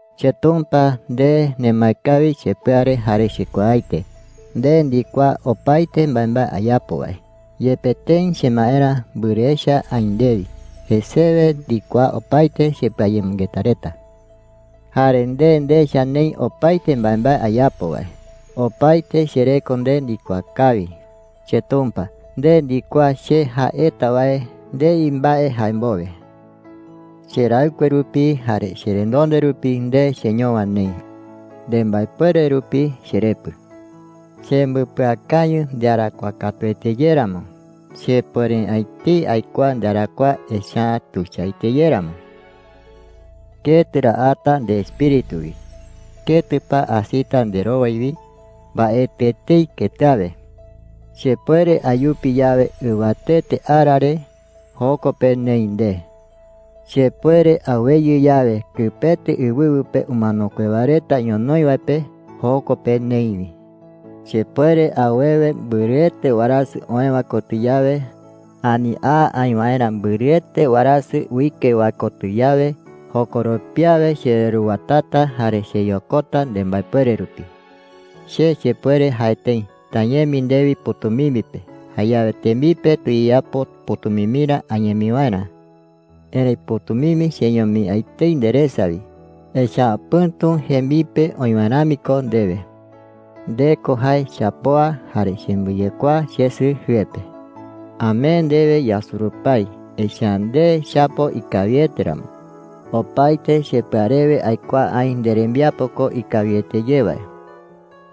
CheTumpa, nde nemae kawi chepɨa re jare chekuaaete. Nde ndikuaa opaete mbaembae ayapo wae. Yepe tëi chemaerä mbɨrɨ echa aï ndewi, jesewe ndikuaa opaete chepɨayemɨngeta reta. Jare nde ndecha neï opaete mbaembae ayapo wae. Opaete chereko nde ndikuaa kawi. CheTumpa, nde ndikuaa che jaeta wae ndei mbae jae mbowe. Cheraɨkue rupi jare cherenonde rupi nde cheñowa neï. Nembaepuere rupi cherepɨ. Chembɨpɨakañɨ ndearakuaa katuete ye ramo. Chepuere’ä etei aikuaa ndearakuaa, echa’ä tuichaete ye ramo. ¿Ketɨ ra ata ndeEspíritu wi? ¿Ketɨ pa asita nderowai wi? Mbaetɨ etei ketɨ awe. Chepuere ayupi yawe ɨwatete ara re, joko pe neï nde. Chepuere aweyɨ yawe kɨpete ɨwɨwɨ pe umanokue wae reta ñonoï wae pe, joko pe neï wi. Chepuere awewe mbɨrɨete warasɨ oë wae kotɨ yawe, ani a aï waerä mbɨrɨete warasɨ uike wae kotɨ yawe, jokoropi awe chereruwatata jare cheyokota nembaepuere rupi. Che chepuere jae tëi: “¡Tañemi ndewi pɨ̈tumimbi pe! Jayawe tembipe tuyeyapo pɨ̈tumimbirä añemi waerä.” Erëi pɨ̈tumimbi cheñomi’ä etei nderesa wi. Echa’ä pɨ̈tu jembipe oï wae rami ko ndewe. Nde ko jae chapoa, jare chembɨyekuaa chesɨ jɨe pe. Amee ndewe yasurupái, echa’ä nde chapo ikawiete ramo. Opaete chepɨa rewe aikuaa aï nderembiapo ko ikawiete ye wae.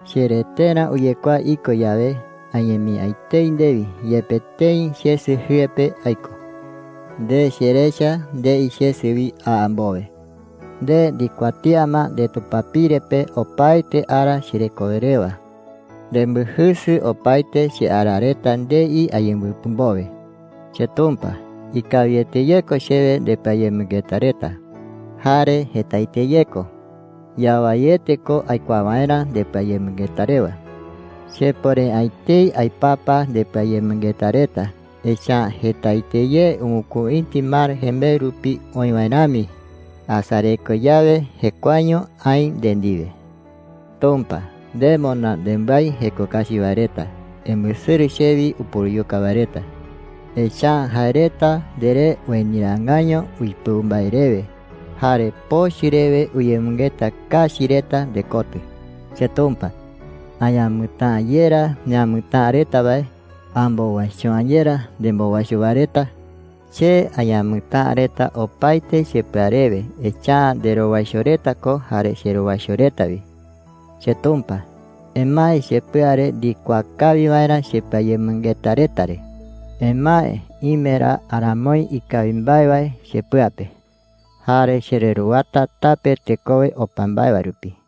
Chereterä uyekuaa iko yawe, añemi’ä etei ndewi yepe tëi chesɨ jɨe pe aiko. Nde cherecha ndei chesɨ wi a mbowe. Nde ndikuatía ma ndetupapire pe opaete ara cherekowe rewa. Nembɨjɨsɨ opaete cheara reta ndei ayembɨpɨ mbowe. CheTumpa, ikawiete ye ko chewe ndepɨayemɨngeta reta, jare jetaete ye ko. Yawaiete ko aikuaa waerä ndepɨayemɨngeta rewa. Chepuere’ä etei aipapa ndepɨayemɨngeta reta, echa’ä jetaete ye ɨwɨkuïti mar jembeɨ rupi oï wae rami. Asareko yawe, jekuaeño aï nde ndiwe. Tumpa, ¡nde moná nembái jeko kachi wae reta! ¡Embɨsɨrɨ chewi upuruyuka wae reta! Echa’ä jae reta nderee ueniraangaiño uipɨu mbae rewe, jare pochɨ rewe uyemɨngeta kachi reta ndekotɨ. CheTumpa, ¿añamɨtäa’ä yerá neamɨtäa reta wae? ¿Ambowaicho’ä yerá nembowaicho wae reta? Che añamɨtäa reta opaete chepɨa rewe, echa’ä nderowaicho reta ko jare cherowaicho reta wi. CheTumpa, emae chepɨa re ndikuaa kawi waerä chepɨayemɨngeta reta re. Emae ime ra aramoi ikawi mbae wae chepɨa pe. Jare chereruwata tape tekowe opa mbae wae rupi.